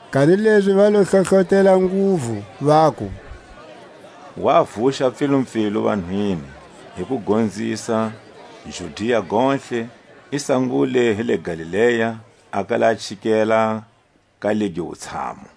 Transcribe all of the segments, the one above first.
Kanilezi va lo hlohlotela nguvu, vaku: Wa vuxa pfilupfilu vanhwini, hi ku gonzisa Judia gontlhe; i sangule hi le Galilea, a kala a chikela ka legi wutshamu.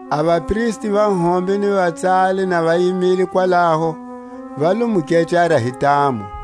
A vapristi va hombe ni vatsali na va yimile kwalaho, va lo mu kecara hi ntamu.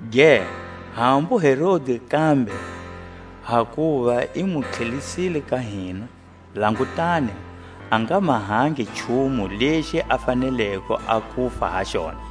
Ge, hambu Herodi kambe, hakuva i mu tlhelisile ka hina; langutani, a nga mahangi nchumu lexi a faneleko a kufa ha xona,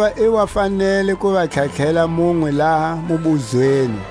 Hakuva i wa fanele ku va tlhatlhela munwe laha mubuzweni.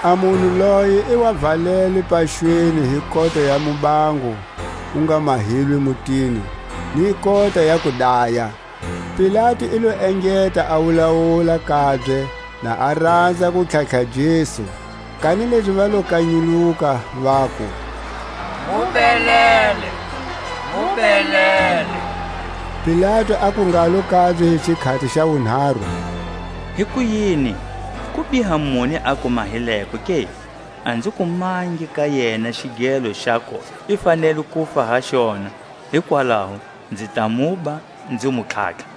A munhu loye i wa valelwe paxweni hi kota ya mubango wu nga mahilwe mutini, ni kota ya kudaya. Pilatu i lo engeta a wulawula kabye, na a ranza ku tlhatlha Jesu; kanilezi va lo kanyuluka, vaku: Mu belele, mu belele! Pilatu aku ngalo kabye hi xikhati xa wunharu: Hikuyini, kubiha muni a ku mahileko ke? A nzi kumangi ka yena xigelo xaku i fanele kufa ha xona; hikwalaho nzi ta muba, nzi mu tlhatlha.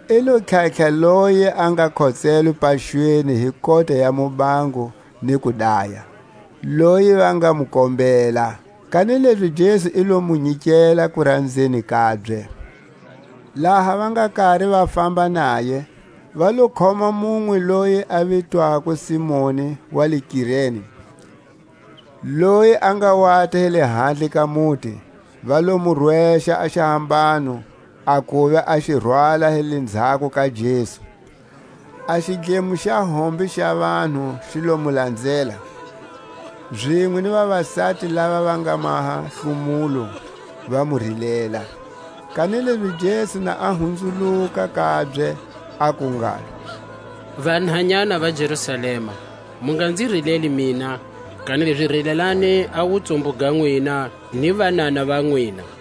I lo tlhatlha loye a nga khotselwe paxweni hi kota ya mubango ni kudaya, loyi va nga mu kombela; kanilezi Jesu i lo mu nyikela kuranzeni kabye. Laha va nga kari va famba naye, va lo khoma munwe loyi a vitwako Simoni wa le Kirene loyi a nga wata hi lahandle ka muti; va lo mu rwexa a xihambano, a kuva a xi rwala hi lenzhako ka Jesu. A xidlemo xa hombe xa vanhu xi lo mu lanzela, zinwe ni vavasati lava va nga maha hlomulo, va mu rilela. Kanilezi Jesu na a hunzuluka kabye, aku ngalo: Vanhanyana va Jerusalema, mu nga nzi rileli mina, kanilezi rilelani a wutsumbu ga nwina, ni vanana va nwina;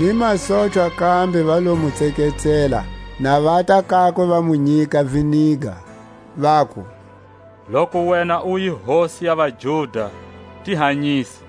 Ni masochwa kambe va lo mu tseketsela, na vata kakwe, va mu nyika viniga, vaku: Loku wena u hi hosi ya vaJuda, ti hanyise.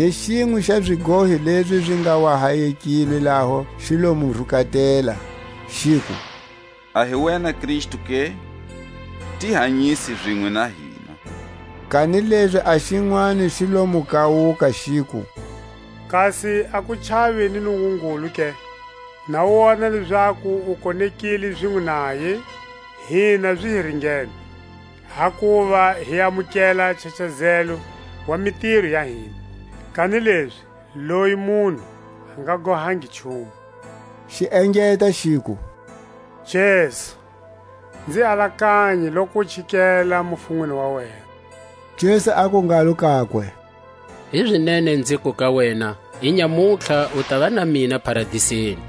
Ni xinwe xa zigohi lezi zi nga wa hayekilwe laho xi lo mu rukatela, xiku: A hi wena Kristu ke? ti hanyise zinwe na hina. Kanilezi a xinwani xi lo mu kawuka, xiku: Kasi a ku chavi ni Nungungulu ke, na u wona lezaku u konekile zinwe naye? Hina zi hi ringene, hakuva hi amukela a nchachazelo wa mitiro ya hina; kanilezi loyi munhu a nga gohangi nchumu. Xi engeta xiku: Jesu, nzi alakanye loku u chikele mufunweni wa wena. Jesu aku ngalo kakwe: Hizinene nziku ka wena; Inyamutlha u tava na mina Paradiseni.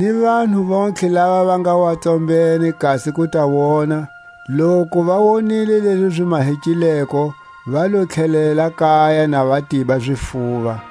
Ni vanhu vontlhe lava va nga wa tsombene kasi ku ta wona, loku va wonile lezi zi mahekileko, va lo tlhelela kaya na va tiba zifuva.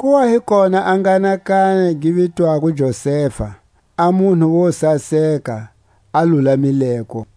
Ku wa hi kona a nghanakana gi vitwako Josefa, a munhu wo saseka, a lulamileko,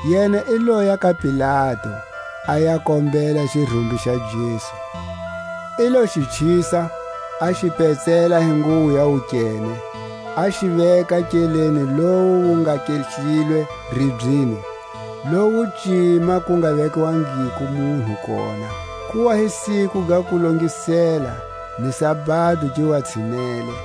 Yena i loya ka Pilatu, a ya kombela xirumbi xa Jesu. I lo xi chisa, a xi petsela hi nguwo ya wukene, a xi veka nkeleni lowu wu nga kehlilwe ribyeni, lowu cima ku nga vekwangiko munhu kona. Ku wa hi siku ga Kulongisela, ni sabado gi wa tshinele.